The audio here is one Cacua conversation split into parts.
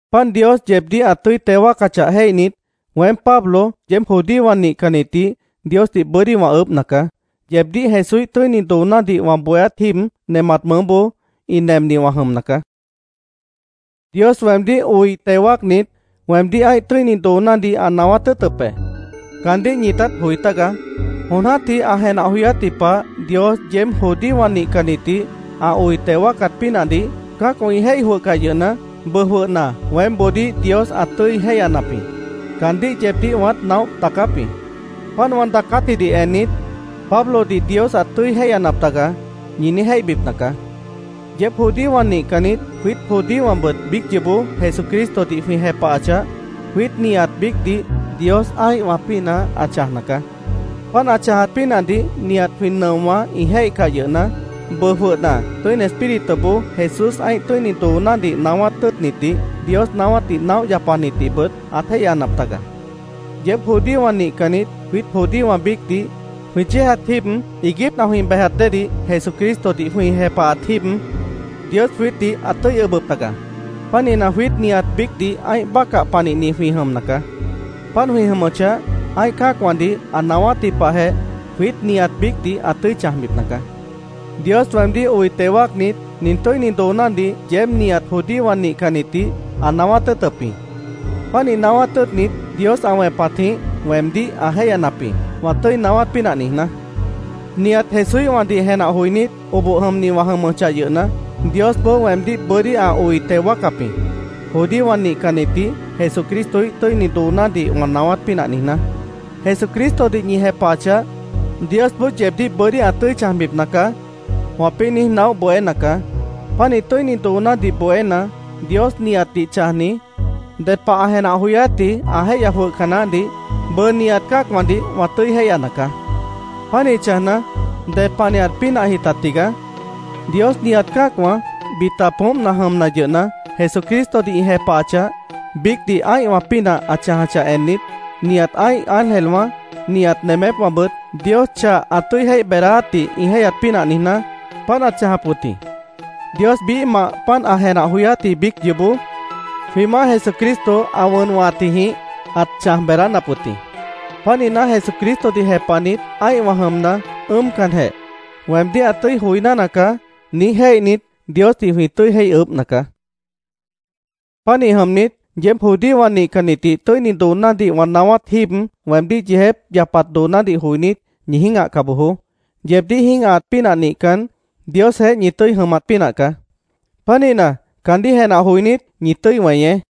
Páant Dios yeebdíh ã tʉ́i teo wáacachah jéihnit, weém, Pablo, yeéb judíowã nihcannitdih Diosdih bʉ́dí wã ʉʉ́bhna caá. Yeebdíh Jesúíh tʉ́ini doonádih wã bohéát jíib nemat mʉʉ́boó ĩ nemni wã jʉmna caá. Dios weemdíh oi teo wáacnit, weemdíh ã́ih tʉ́ini doonádih ã naáwát tʉ́ʉtʉp be. Caandíh ñitát joi tágaá. Jon jã́tih ã jenah joyátji pah Dios yeéb judíowã nihcannitdih ã oi teo wáacat pínahdih cã́acwã ĩ jéih jwʉhcah yʉhna, bʉʉ jwʉhna weémboodíh Dios ã tʉ́i jéihyanap jĩ. Caandíh yeebdíh wãát naóh daacáp jĩ. Páant wã daacátjidih ennit, “Pablodih Dios ãt tʉ́i jéihyanap taga”, ñi niíj jéihbipna caá. Yeéb judíowã nihcannit, jwiít judíowãbʉt biíc yoobó Jesucristodih jwĩ jepahachah, jwiít nihat biícdih Dios ã́ihwã pínah ã chãjna caá. Páant ã chãjat pínahdih nihat jwĩ nʉowã ĩ jéihcah yʉhna, bʉʉ jwʉhna Tʉ́ini Espírituboó Jesús ã́ih tʉ́ini doonádih naáwát tʉ́ʉtnitdih, Dios naáwátdih naóh yapanitdihbʉt ãt jéihyanap taga. Yeéb judíowã nihcannit, jwiít judíowã biícdih, jwĩ yéejat jíib iiguípna jwĩ bejat déedih, Jesucristodih jwĩ jepahat jíib, Dios jwiítdih ãt tʉ́i ʉbʉp taga. Pánihna, jwiít nihat biícdih ã́ih bácah panihni jwĩ jʉmna caá. Páant jwĩ jʉmʉchah, ã́ih cã́acwãdih ã naáwátji pahjeh jwiít nihat biícdih ã tʉ́i chãjbipna caá. Dios weemdíh oi teo wáacnit, nin tʉ́ini doonádih yeéb nihat judíowã nihcannitdih ã naáwát tʉ́ʉtʉp jĩ. Pánih naáwát tʉ́ʉtnit, Dios ã wẽpatjĩh weemdíh ã jéihyanap jĩ, wã tʉ́i naáwát pínah niijná. Nihat Jesúíhwãdih jenah joinít, oboh jʉmni wã jʉmʉchah yʉhna, Diosboó weemdíh bʉ́dí ã oi teo wáacap jĩ, judíowã nihcannitdih Jesucristoíh tʉ́i doonádih wã naáwát pínah niijná. “Jesucristodih ñi jepahachah, Diosboó yeebdíh bʉ́dí ã tʉ́i chãjbipna caá”, wãpĩ́ niíj naóh bohéna caá. Pánih tʉ́ini doonádih bohéna, Dios nihatdih chãjni, ded pah ã jenah joyátji ã jéihya jwʉhca naáhdih bʉʉ nihat cã́acwãdih wã tʉ́i jéihyana caá. ¿Pánih chãjna, ded panihat pínahji ta tigaá? Dios nihat cã́acwã, bita poómpna jʉmna yʉhna, Jesucristodih ĩ jepahachah, biícdih ã́ihwã pínah ã chãjachah ennit, nihat ã́ih ángelwã, nihat nemépwãbʉt Dios chah ã tʉ́i jéih beedáátdih ĩ jéihyat pínah niijná, páant ãt chãjap wʉt jĩ. Dios biíhmah páant ã jenah joyátji biíc yoobó, jwĩ Maáh Jesucristo ã wʉn wʉ̃hatjijĩh ãt chãj beedánap wʉt jĩ. Pánihna, Jesucristodih jepahnit, ã́ihwã jʉmna, ʉ́ʉmcanjeh, “Weemdíh ã tʉ́i joiná nacaá”, niíj jéihnit, Diosdih jwĩ tʉ́i jéih ʉʉ́bhna caá. Pánih jʉmnit, yeéb judíowã nihcannitdih tʉ́ini doonádih wã naáwát jíib weemdíh yeejép yapat doonádih joinít, ñi jĩ́gahca bojoó. Yeebdíh jĩ́gahaat pínah nihcan, Diosjeéh ñi tʉ́i jʉmat pínah caá. Pánihna, caandíh jenah joinít, ñi tʉ́i weñeé.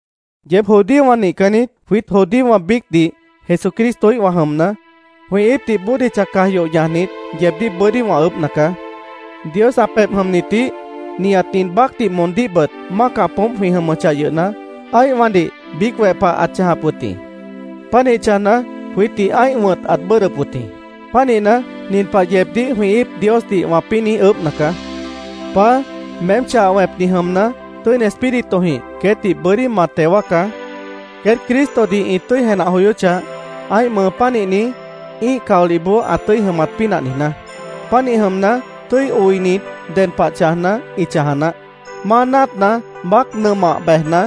Yeéb judíowã nihcannit, jwiít judíowã biícdih Jesucristoíhwã jʉmna, jwĩ íipdih bódicha caj yoh ñajnit, yeebdíh bʉ́dí wã ʉʉ́bhna caá. Dios ã pebh jʉmnitdih, nihat nin baácdih moondíhbʉt mácah poómp jwĩ jʉmʉchah yʉhna, ã́ihwãdih biíc weh pah ãt chãjap wʉt jĩ. Pánih chãjna, jwiítdih ã́ih wʉ̃t ãt bʉ́ʉdhdʉp wʉt jĩ. Pánihna, nin pah yeebdíh jwĩ íip Diosdih wãpĩ́ niíj ʉʉ́bhna caá: “Paá, meém chah wẽpni jʉmna, Tʉ́ini Espíritujĩh queétdih bʉ́dí ma teo wáacá, queét Cristodih ĩ tʉ́i jenah joyóchah, ã́ih mʉʉ pánihni, ĩ́ih caolihboó ã tʉ́i jʉmat pínah niijná. Pánih jʉmna, tʉ́i oinit, ded pah chãjna, ĩ chãja naáh. Máa náatna baác nʉmah bejna,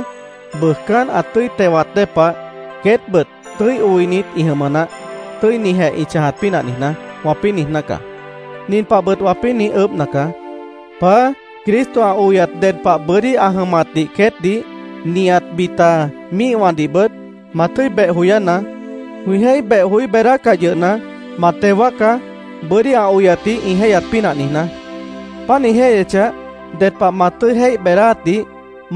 bʉʉjcán ã tʉ́i tewat dée pah, queétbʉt tʉ́i oinit ĩ jʉmʉ naáh, tʉ́inijeh ĩ chãjat pínah niijná”, wãpĩ́ niijná caá. Nin pahbʉt wãpĩ́ niíj ʉʉ́bhna caá. “Paá, Cristo ã oyat ded pah bʉ́dí ã jʉmatdih queétdih, nihat bita míihwãdihbʉt, ma tʉ́i beh joyánaá. Jwĩ jéih beh joí beedácah yʉhna, ma teo wáacá, bʉ́dí ã oyatdih ĩ jéihyat pínah niijná. Páant ĩ jéihyechah, ded pah ma tʉ́i jéih beedáátdih,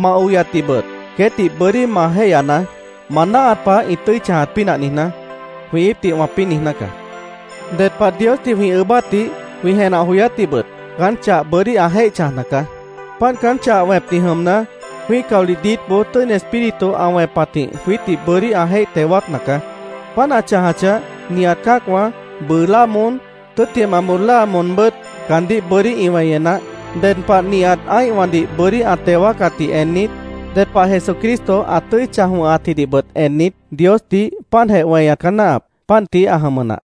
ma oyatdihbʉt queétdih bʉ́dí ma jéihyanaá, ma náahat pah ĩ tʉ́i chãjat pínah niijná”, jwĩ íipdih wãpĩ́ niijná caá. Ded pah Diosdih jwĩ ʉʉ́bátdih, jwĩ jenah joyátdihbʉt caán chah bʉ́dí ã jéih chãjna caá. Páant caán chah wẽpni jʉmna, jwĩ́ih caolih diítboó Tʉ́ini Espíritu ã wẽpatjĩh jwiítdih bʉ́dí ã jéih teo wáacna caá. Páant ã chãjachah, nihat cã́acwã, bʉʉ láa moón, tʉ́ttimah bóo láa moonbʉ́t caandíh bʉ́dí ĩ weñe naáh. Ded pah nihat ã́ihwãdih bʉ́dí ã teo wáacatdih ennit, ded pah Jesucristo ã tʉ́i chãj wʉ̃hatjidihbʉt ennit, Diosdih páantjeh weñat caá náahap. Páant tií ã jʉmʉ nah.